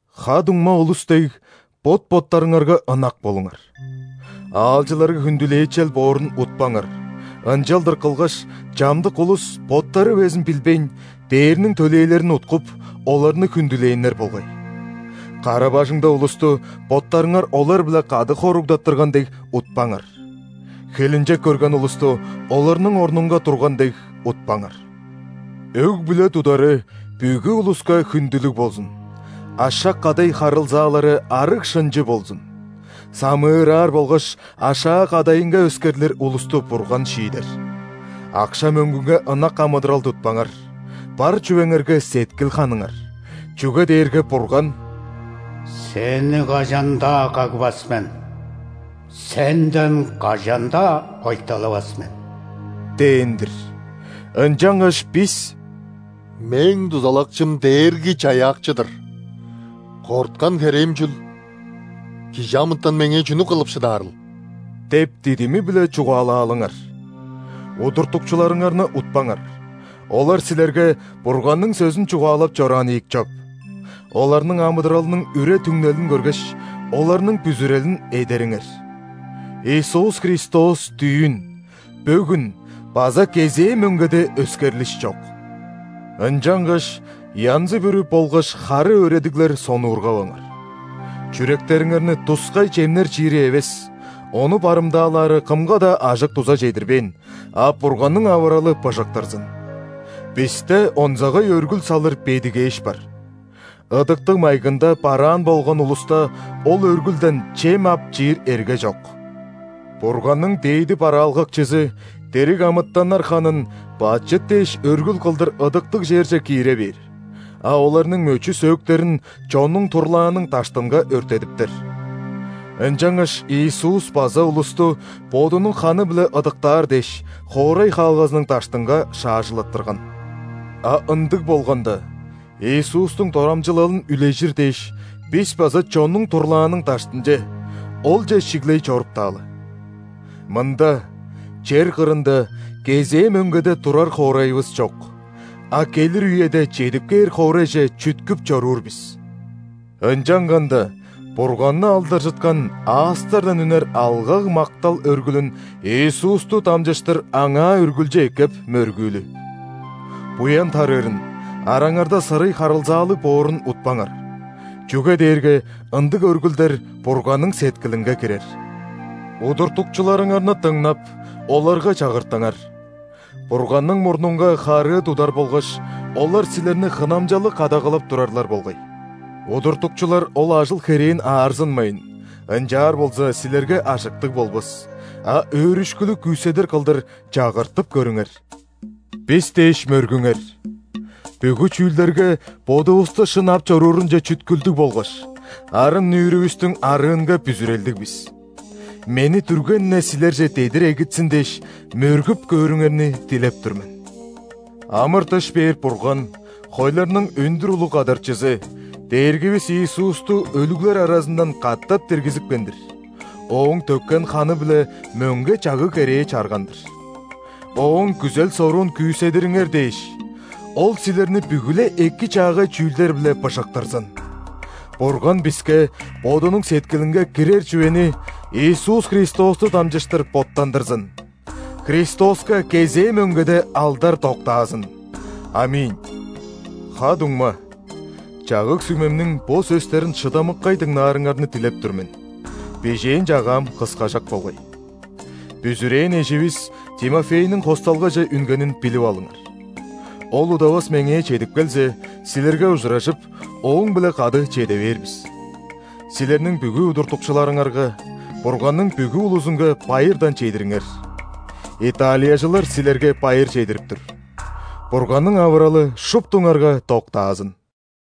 Ха-дуңма улус дег, бот-боттарыңарга ынак болуңар. Аалчыларга хүндүлээчел боорун утпаңар, ынчалдыр кылгаш, чамдык улус, боттары безин билбейн, ·дээрниң төлээлерин уткуп, оларны хүндүлээннер болгай. Кара-бажыңда улусту, боттарыңар олар-биле кады хоругдаттырган дег, утпаңар; хилинчек көрген улусту, оларның орнунга турган дег, утпаңар. Өг-бүле тудары бүгү улуска хүндүлүг болзун, ашак, кадай харылзаалары арыг-шынчы болзун. Самыыраар болгаш ашаа-кадайынга өскерлир улусту Бурган шиидер. Акша-мөңгүнге ынак амыдырал тутпаңар, бар чүвеңерге сеткил ханыңар. Чүге дээрге Бурган:«Сени кажан-даа кагбас мен, сенден кажан-даа ойталавас мен» – дээн-дир. Ынчангаш бис:«Мээң дузалакчым – Дээрги-Чаяакчы-дыр, корткан херээм чүл:кижи амытан меңээ чүнү кылып шыдаарыл?» – деп дидими-биле чугаалаалыңар. Удуртукчуларыңарны утпаңар, олар силерге Бурганның сөзүн чугаалап чораан ийик чоп. Оларның амыдыралының үре-түңнелин көргеш, оларның бүзүрелин эдериңер. Иисус Христос дүүн, бөгүн база кезээ мөңгеде өскерлиш чок. Ынчангаш янзы-бүрү болгаш хары өөредиглер сонуургаваңар. Чүректериңерни тускай чемнер чиири эвес (ону барымдаалаары кымга-даа ажык-дуза чедирбээн), а Бурганның авыралы быжыктырзын. Бисте онзагай өргүл салыр бедигээш бар, ыдыктыг майгында бараан болган улуста ол өргүлден чем ап чиир эрге чок. Бурганның дээди бараалгакчызы дириг амытаннар ханын бачыт дээш өргүл кылдыр ыдыктыг черже киире бээр, а оларның мөчү-сөөктерин чоннуң турлааның даштынга өрттедиптер. Ынчангаш Иисус база улусту Бодунуң ханы-биле ыдыктаар дээш, хоорай хаалгазының даштынга шаажылаттырган. А ындыг болганда, Иисустуң дорамчылалын үлежир дээш, бис база чоннуң турлааның даштынче, Олче шиглей чоруптаалы. Мында, чер кырында, кезээ мөңгеде турар хоорайывыс чок, а келир үеде чедип кээр хоорайже чүткүп чоруур бис. Ынчанганда Бурганны алдаржыткан аастардан үнер алгаг-мактал өргүлүн Иисусту дамчыштыр Аңаа үргүлчү эккеп, мөргүүлү. Буян тарыырын, араңарда сырый харылзаалыг боорун утпаңар, чүге дээрге ындыг өргүлдер Бурганның сеткилинге кирер. Удуртукчуларыңарны дыңнап, оларга чагыртыңар. Бурганның мурнунга харыы тудар болгаш, олар силерни хынамчалыг кадагалап турарлар болгай. Удуртукчулар ол ажыл-херээн аарзынмайн (ынчаар болза, силерге ажыктыг болбас), а өөрүшкүлүг күүседир кылдыр чагыртып көрүңер. Бис дээш мөргүңер. Бүгү чүүлдерге бодувусту шын ап чоруурунче чүткүлдүг болгаш, арын-нүүрүвүстүң арыынга бүзүрелдиг бис. Мени дүрген-не силерже дедир эгитсин дээш, мөргүп көөрүңерни дилеп тур мен. Амыр-дыш бээр Бурган хойларның өндүр улуг Кадарчызы – Дээргивис Иисусту өлүглер аразындан катап диргизипкен-дир, Ооң төккен ханы-биле мөңге чагыг-керээ чарган-дыр. Ооң күзел-соруун күүседириңер дээш, Ол силерни бүгү-ле эки-чаагай чүүлдер-биле быжыктырзын! Бурган биске Бодунуң сеткилинге кирер чүвени Иисус Христосту дамчыштыр боттандырзын. Христоска кезээ мөңгеде алдар доктаазын! ·Аминь. Ха-дуңма, чагыг-сүмемниң бо сөстерин шыдамыккай дыңнаарыңарны дилеп тур мен, бижээн чагаам кыскажак болгай. Бүзүрээн эживис Тимофейниң хосталгаже үнгенин билип алыңар. Ол удавас меңээ чедип келзе, силерге ужуражып, ооң-биле кады чеде бээр бис. Силерниң бүгү удуртукчуларыңарга, Бурганның бүгү улузунга байырдан чедириңер. Италияжылар силерге байыр чедирип тур. Бурганның авыралы шуптуңарга доктаазын!